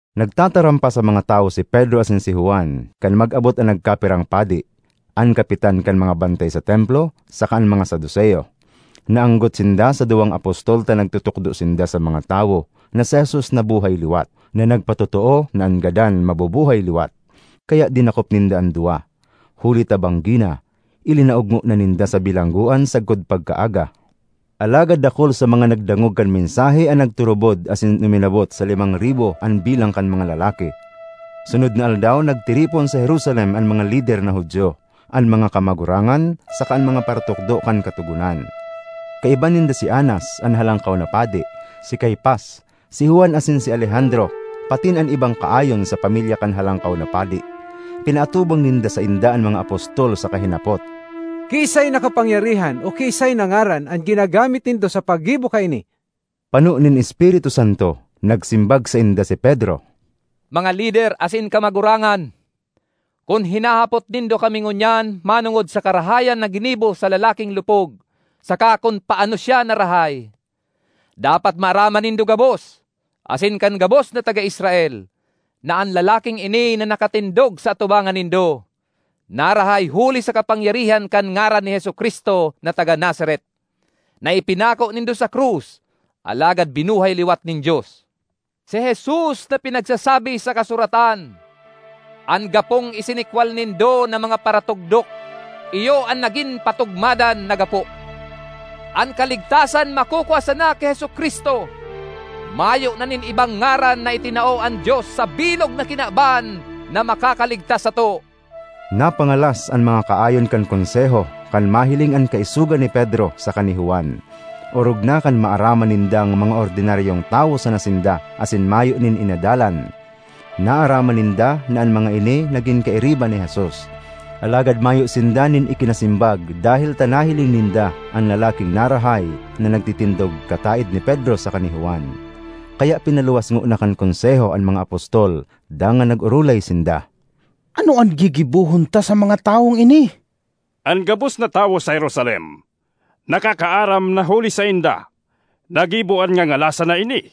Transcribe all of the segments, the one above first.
Nagtataram pa sa mga tawo si Pedro asin si Juan, kan mag-abot an nagkapirang padi, an kapitan kan mga bantay sa Templo, saka an mga Saduceo. Naanggot sinda sa duwang apostol ta nagtutukdo sinda sa mga tawo na si Jesus nabuhay liwat, na nagpatotoo na an gadan mabubuhay liwat. Kaya dinakop ninda an duwa; huli ta banggi na, ilinaog ngona sinda sa bilanggoan sagkod pagkaaga. Alagad dakul sa mga nagdangog kan mensahe an nagturubod asin uminabot sa limang ribo an bilang kan mga lalaki. Sunod na aldaw, nagtiripon sa Jerusalem an mga lider na Judio, an mga kamagurangan saka an mga paratukdo kan Katogonan. Kaiba ninda si Anas, an Halangkaw na Padi, si Caifas, si Juan asin si Alejandro patin an ibang kaayon sa pamilya kan Halangkaw na Padi. Pinaatubang ninda sainda an mga apostol saka hinapot, “Kiisay na kapangyarihan o kiisay na ngaran an ginagamit nindo sa paggibo kaini?” Pano nin Espiritu Santo, nagsimbag sainda si Pedro, “Mga lider asin kamagurangan: kun hinahapot nindo kami ngunyan manongod sa karahayan na ginibo sa lalaking lupog saka kun paano siya narahay, dapat maaraman nindo gabos, asin kan gabos na taga Israel, na an lalaking ini na nakatindog sa atubangan nindo, narahay huli sa kapangyarihan kan ngaran ni Jesu-Cristo na taga Nazaret, na ipinako nindo sa krus alagad binuhay liwat nin Dios. Si Jesus an pinagsasabi sa kasuratan, ‘An gapong isinikwal nindo na mga paratugdok, iyo an nagin patugmadan na gapo.’ An kaligtasan makukua sana ki Jesu-Cristo; mayo na nin ibang ngaran na itinao an Dios sa bilog na kinaban na makakaligtas sato.” Napangalas an mga kaayon kan Konseho kan mahiling an kaisogan ni Pedro saka ni Juan, orog na kan maaraman nindang mga ordinaryong tawo sana sinda asin mayo nin inadalan. Naaraman ninda na an mga ini nagin kairiba ni Jesus. Alagad mayo sinda nin ikinasimbag dahel ta nahiling ninda an lalaking narahay na nagtitindog kataed ni Pedro saka ni Juan. Kaya pinaluwas ngona kan Konseho an mga apostol dangan nag-orolay sinda. ”Ano an gigibohon ta sa mga tawong ini? An gabos na tawo sa Jerusalem nakakaaram na huli sainda nagibo an ngangalasan na ini;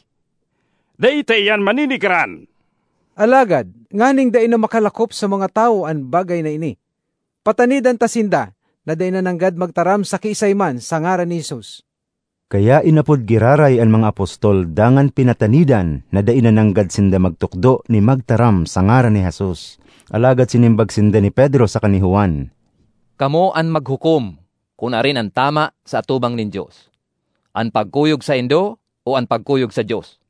dai ta iyan manenegaran. Alagad nganing dai na makalakop sa mga tawo an bagay na ini, patanidan ta sinda na dai na nanggad magtaram sa kiisay man sa ngaran ni Jesus.” Kaya inapod giraray an mga apostol dangan pinatanidan na dai na nanggad sinda magtukdo ni magtaram sa ngaran ni Jesus. Alagad sinimbag sinda ni Pedro saka ni Juan, “Kamo an maghukom kun arin an tama sa atubang nin Dios: an pagkuyog saindo o an pagkuyog sa Dios?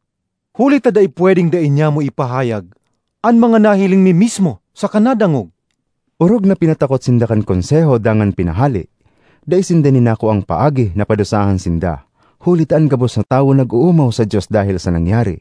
Huli ta dai pwedeng dai nyamo ipahayag an mga nahiling mi mismo saka nadangog.” Orog na pinatakot sinda kan Konseho dangan pinahale. Dai sinda nin nakuang paagi na padusahan sinda, huli ta an gabos na tawo nag-oomaw sa Dios dahel sa nangyari.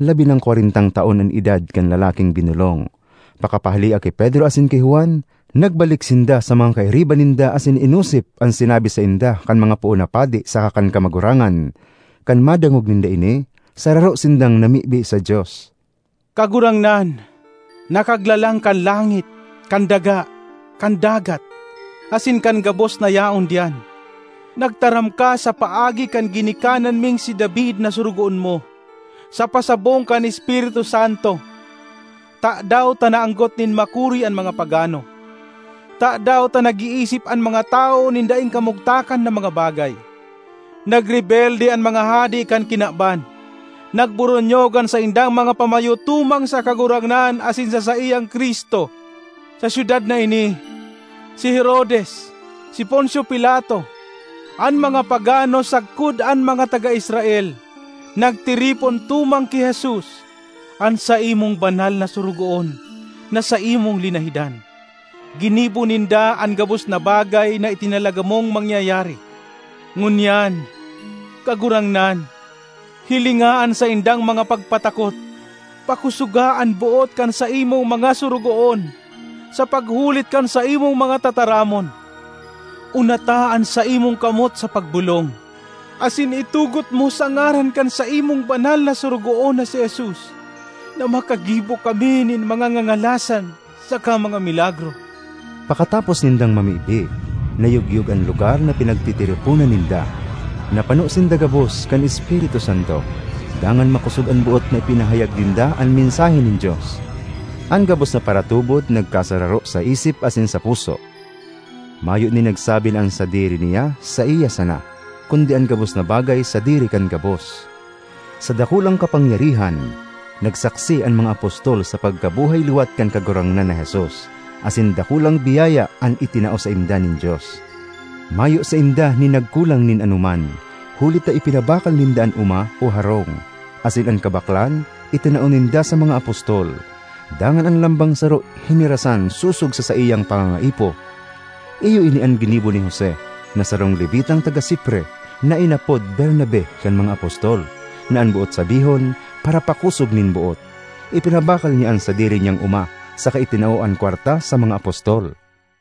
Labi nang kwarentang taon an edad kan lalaking binolong. Pakapahalea ki Pedro asin ki Juan, nagbalik sinda sa mga kairiba ninda asin inosip an sinabi sainda kan mga poon na padi saka kan kamagurangan. Kan madangog ninda ini, sararo sindang namibi sa Dios, “Kagurangnan, na Kaglalang kan langit, kan daga, kan dagat, asin kan gabos na yaon diyan, nagtaram ka sa paagi kan ginikanan ming si David na sorogoon mo, sa pasabong kan Espiritu Santo: ‘Tadaw ta naanggot nin makuri an mga pagano? Tadaw ta nag-iisip an mga tawo nin daing kamugtakan na mga bagay? Nagrebelde an mga hade kan kinaban, nagboronyog an saindang mga pamayo tumang sa Kagurangnan asin sa saiyang Cristo.’ Sa syudad na ini, si Herodes, si Poncio Pilato, an mga pagano sagkod an mga taga Israel nagtiripon tumang ki Jesus, an saimong banal na Sorogoon na saimong linahidan. Ginibo ninda an gabos na bagay na itinalaga mong mangyayari. Ngunyan, Kagurangnan, hilinga an saindang mga pagpatakot. Pakosoga an boot kan saimong mga sorogoon sa paghulit kan saimong mga tataramon. Unata an saimong kamot sa pagbolong, asin itugot mo sa ngaran kan saimong banal na Sorogoon na si Jesus na makagibo kami nin mga ngangalasan saka mga milagro.” Pakatapos nindang mamibi, nayogyog an lugar na pinagtitiriponan ninda. Napano sinda gabos kan Espiritu Santo, dangan makosog an boot na ipinahayag ninda an mensahe nin Dios. An gabos na paratubod nagkasararo sa isip asin sa puso. Mayo nin nagsabi na an sadiri niya saiya sana, kundi an gabos na bagay sadiri kan gabos. Sa dakulang kapangyarihan, nagsaksi an mga apostol sa pagkabuhay liwat kan Kagurangnan na Jesus, asin dakulang biyaya an itinao sainda nin Dios. Mayo sainda nin nagkulang nin anoman, huli ta ipinabakal ninda an oma o harong, asin an kabaklan itinao ninda sa mga apostol; dangan an lambang saro hinirasan sosog sa saiyang pangangaipo. Iyo ini an ginibo ni Jose, na sarong Levitang taga Cipre, na inapod Bernabe kan mga apostol (na an boot sabihon, “Parapakosog nin Boot”). Ipinabakal niya an sadiri niyang oma, saka itinao an kwarta sa mga apostol.